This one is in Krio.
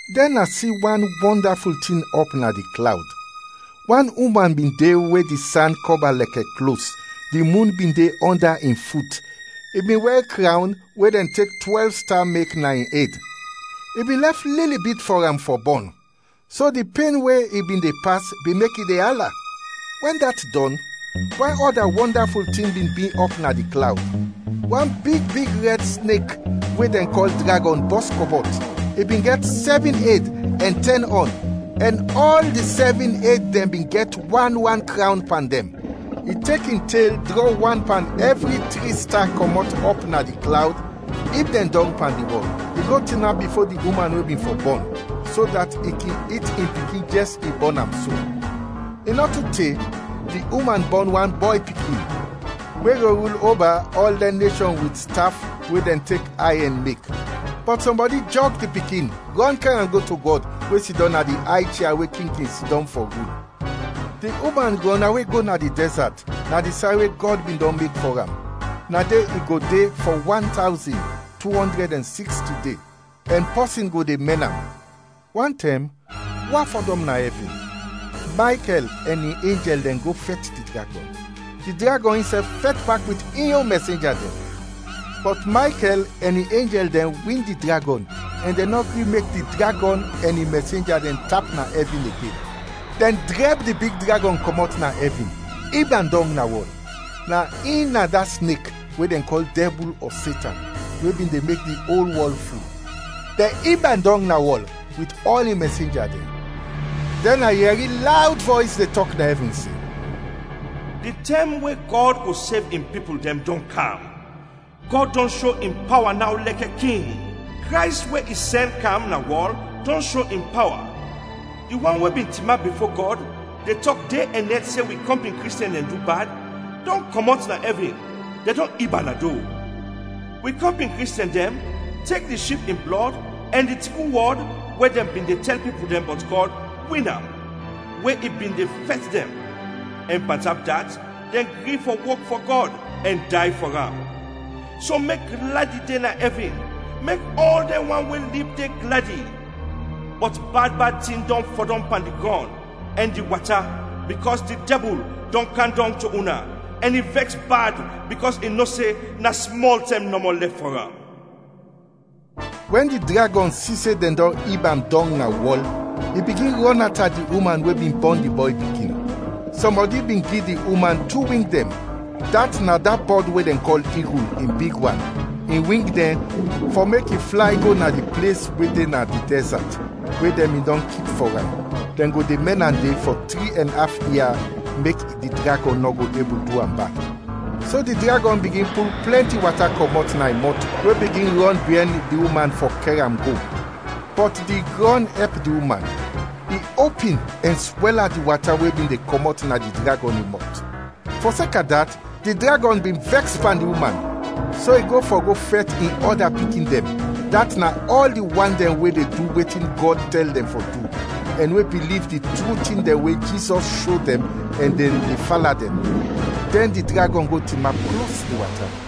Dɛn a si wan wɔndaful tin ɔp na di klawd. Wan uman bin de we di san kɔba lɛkɛ klos, di mun bin de ɔnda in fut, i bin wɛr krawn, we dɛn tek twɛlv sta mek, na in ed. I bin lɛf lili bit fɔ am fɔ bɔn, so di pen we i bin de pas bin mek i de ala. Wɛn dat dɔn, wan ɔda wɔndaful tin bin bi ɔp na di klawd. Wan big big rɛd snek we dɛn kɔl dragɔn bɔs kɔmɔt, i bin gɛt sɛvin ed ɛn tɛn ɔn, ɛn ɔl di sɛvin ed dɛn bin gɛt wan wan krawn pan dɛn. I tek in tel drɔ wan pan ɛvri tri sta kɔmɔt ɔp na di klawd, ib dɛn dɔng pan di wɔl. I go tinap bifo di uman we bin fɔ bɔn, so dat i kin it in pikin jɛs i bɔn am so. I nɔ tu te, di uman bɔn wan bɔy pikin, we go rul oba ɔl dɛn neshɔn wit staf we dɛn tek ayɛn mek. Bɔt sɔmbɔdi jɔg di pikin rɔn kɛr am go to Gɔd we sidɔm na di ay chia we king kin sidɔm fɔ rul. Di uman rɔnawe go na di dɛzat, na di say we Gɔd bin dɔn mek fɔ am, na de i go de fɔ wan tawzin, tu ɔndrɛd ɛn siksti de, ɛn pɔsin go de mɛn am. Wantɛm, wa fɔdɔm na ɛvin, Maykɛl ɛn in enjɛl dɛn go fɛt di dragɔn, di dragɔn insɛf fɛt bak wit in yon mɛsenja dɛn; bɔt Maykɛl ɛn in enjɛl dɛn win di dragɔn ɛn dɛn nɔ gri mek di dragɔn ɛn in mɛsenja dɛn tap na ɛvin igen. Dɛn drɛb di big dragɔn kɔmɔt na ɛvin, ib am dɔng na wɔl! Na in na da snek we dɛn kɔl Dɛbul ɔ Setan, we bin de mek di ol wɔl ful. Dɛn ib am dɔng na wɔl, wit ɔl in mɛsenja dɛn. Dɛn a yɛri lawd vɔys de tɔk na ɛvin se, “Di tɛm we Gɔd go sev in pipul dɛn, dɔn kam! Gɔd dɔn sho in pawa naw lɛkɛ king! Krays we i sɛn kam na wɔl dɔn sho in pawa! Di wan we bin tinap bifo Gɔd de tɔk de ɛn nɛt se wi kɔmpin Kristiɛn dɛn du bad, dɔn kɔmɔt na ɛvin, dɛn dɔn ib am na do. Wi kɔmpin Kristiɛn dɛn tek di Ship in blɔd ɛn di tru wɔd we dɛn bin de tɛl pipul bɔt Gɔd win am, we i bin de fɛt dɛn; ɛn pantap dat, dɛn gri fɔ wok fɔ Gɔd ɛn day fɔ am. So mek gladi de na ɛvin, mek ɔl dɛn wan we lib de gladi! Bɔt bad bad tin dɔn fɔdɔm pan di grɔn ɛn di wata bikɔs di Dɛbul dɔn kam dɔng to una ɛn i vɛks bad bikɔs i no se na smɔl tɛm nɔmɔ lɛf fɔ am.” Wɛn di dragɔn si se dɛn dɔn ib am dɔng na wɔl, i bigin rɔnata di uman we bin bɔn di bɔy pikin. Sɔmbɔdi bin gi di uman tu wings, dat na da bɔd we dɛn kɔl igul, in big wan, in wing dɛn, fɔ mek i flay go na di ples we de na di dɛzat, we dɛn bin dɔn kip fɔ am, dɛn go de mɛn am de fɔ tri ɛn af ia mek di dragɔn nɔ go ebul du am bad. So di dragɔn bigin pul plɛnti wata kɔmɔt na in mɔt we bigin rɔn biɛn di uman fɔ kɛr am go. Bɔt di grɔn ɛp di uman; i opin ɛn swɛla di wata we bin de kɔmɔt na di dragɔn in mɔt. Fɔseka dat, di dragɔn bin vɛks pan di uman, so i go fɔ go fɛt in ɔda pikin dɛn, dat na ɔl di wan dɛn we de du wetin Gɔd tɛl dɛn fɔ du, ɛn we biliv di tru tin dɛn we Jizɔs sho dɛn ɛn dɛn de fala dɛn. Dɛn di dragɔn go tinap klos di wata.